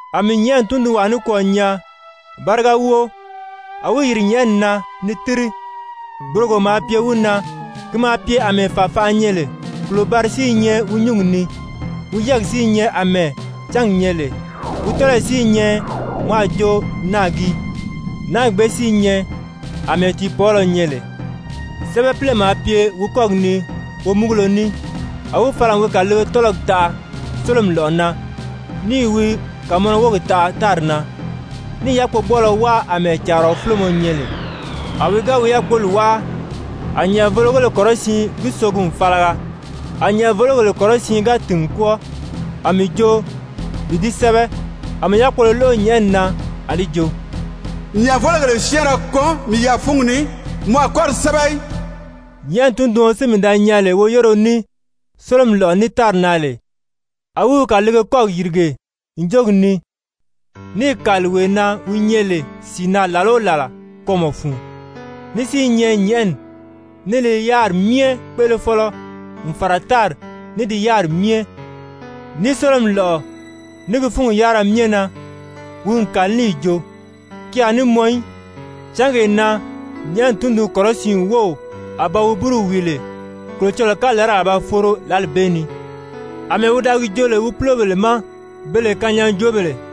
A mii nyɛ̀ʔɛni tundunwaa nikwɔɔ nyaa, báriga wóo, a wi yìri nyɛ̀ʔɛni na ni tíri, burogo maa pye wi na, ki maa pye àmɛɛ fàfanʔa nyɛ lè. Kùlobari si i nyɛ wi nyúngi ni, wi yɛ́ɛgi si i nyɛ àmɛɛ cángi nyɛ lè, wi tɔ́lɔyi si i nyɛ mɔ a jo naà gii, náagi bee si i nyɛ àmɛɛ tiipɔɔlɔ nyɛ lè. Sɛ́bɛpile maa pye wi kɔ́gi ni womúgulo ní. A wi fala n wi kàliige tɔ́lɔgi taʔa sólomi lɔ̀ʔɔ na, níì wi kàmɔnɔ wógi taʔa tári na, níì yákpogbɔɔlɔ wáa àmɛɛ càaraɔ fúlomɔ nyɛ lè. A wi ga wi yákpoli wáa, a nyɛ̀ʔɛvōlogéle kɔrɔsiin gi sogi n falaga. A nyɛ̀ʔɛvōlogèle kɔrɔsiin ga tìn n kwɔ́ɔ, a mii jo bi di sɛ́bɛ, a mii yákpolo lóʔo nyɛ̀ʔɛni na, a li jo: «Nyɛ̀ʔɛvōlogèle syɛ́ɛnrɛ kɔn miyɛɛ fúngi ni, mɔ a kɔ́ di sɛ́bɛ í.» Nyɛ̀ʔɛni tunduɔn si mii da nyaa lè woyéreo ní sólomi lɔ̀ʔɔ ní tári na lè, a wi wi kàliige kɔ́gi yìrige ǹjogi ni níì kàli wee na wi nyɛ lè sìi na làla o làla kwɔ́ɔmɔ fun, ní si i nyɛ nyɛ̀ʔɛni ní li yáriri myɛ kpéʔelefɔlɔ, n fàra tári, ní di yáriri myɛ, ní sólomi lɔ̀ʔɔ, ní gi fúngi yárira myɛ na, wi n kàli níì jo: «Ki a ní mɔn í. Cángee na nyɛ̀ʔɛni tundun-kɔrɔsiin wów a ba wi búruw wìi lè, Kolocɔlɔɔ kalarali a ba foro lǎli bee ni, àmɛɛ wi da gi joo lè wi púlobèle ma, be lè kanyaajoobèle.»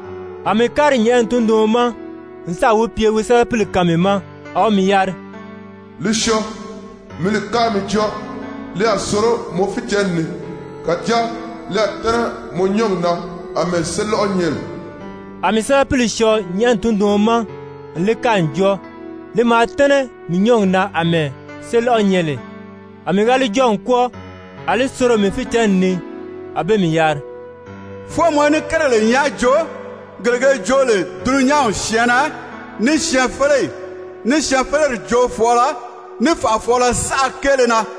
A mii kári nyɛ̀ʔɛni tunduɔn ma n sáà wi pye wi sɛ́bɛpili kaan mii ma. A wi mii yari: «Li syɔɔ, mi li káa mi jɔ́ɔ, li a soro mɔ fícɛnni ni, kàjáa li a tɛ́nɛ mɔ nyɔ́ɔgi na àmɛɛ sélɔʔɔ nyɛ lè.» A mii sɛ́bɛpili syɔɔ nyɛ̀ʔɛni tunduɔn ma n li káa n jɔ́ɔ, li maa tɛ́nɛ mii nyɔ́ɔgi na àmɛɛ sélɔʔɔ nyɛ lè, a mii ga li jɔ́ɔ n kwɔ́ɔ, a li soro mii fícɛnni ni. A be mii yari: «Fwɔɔ mɔ í ní kérigèle nyaa joo, gele ge joo lè dulunyanw syɛ̀ɛnnɛ, ní syɛɛnfeleyi, ní syɛɛnfeleri joofɔɔlɔ, ní fànʔafɔɔlɔ saʔa kéele na.»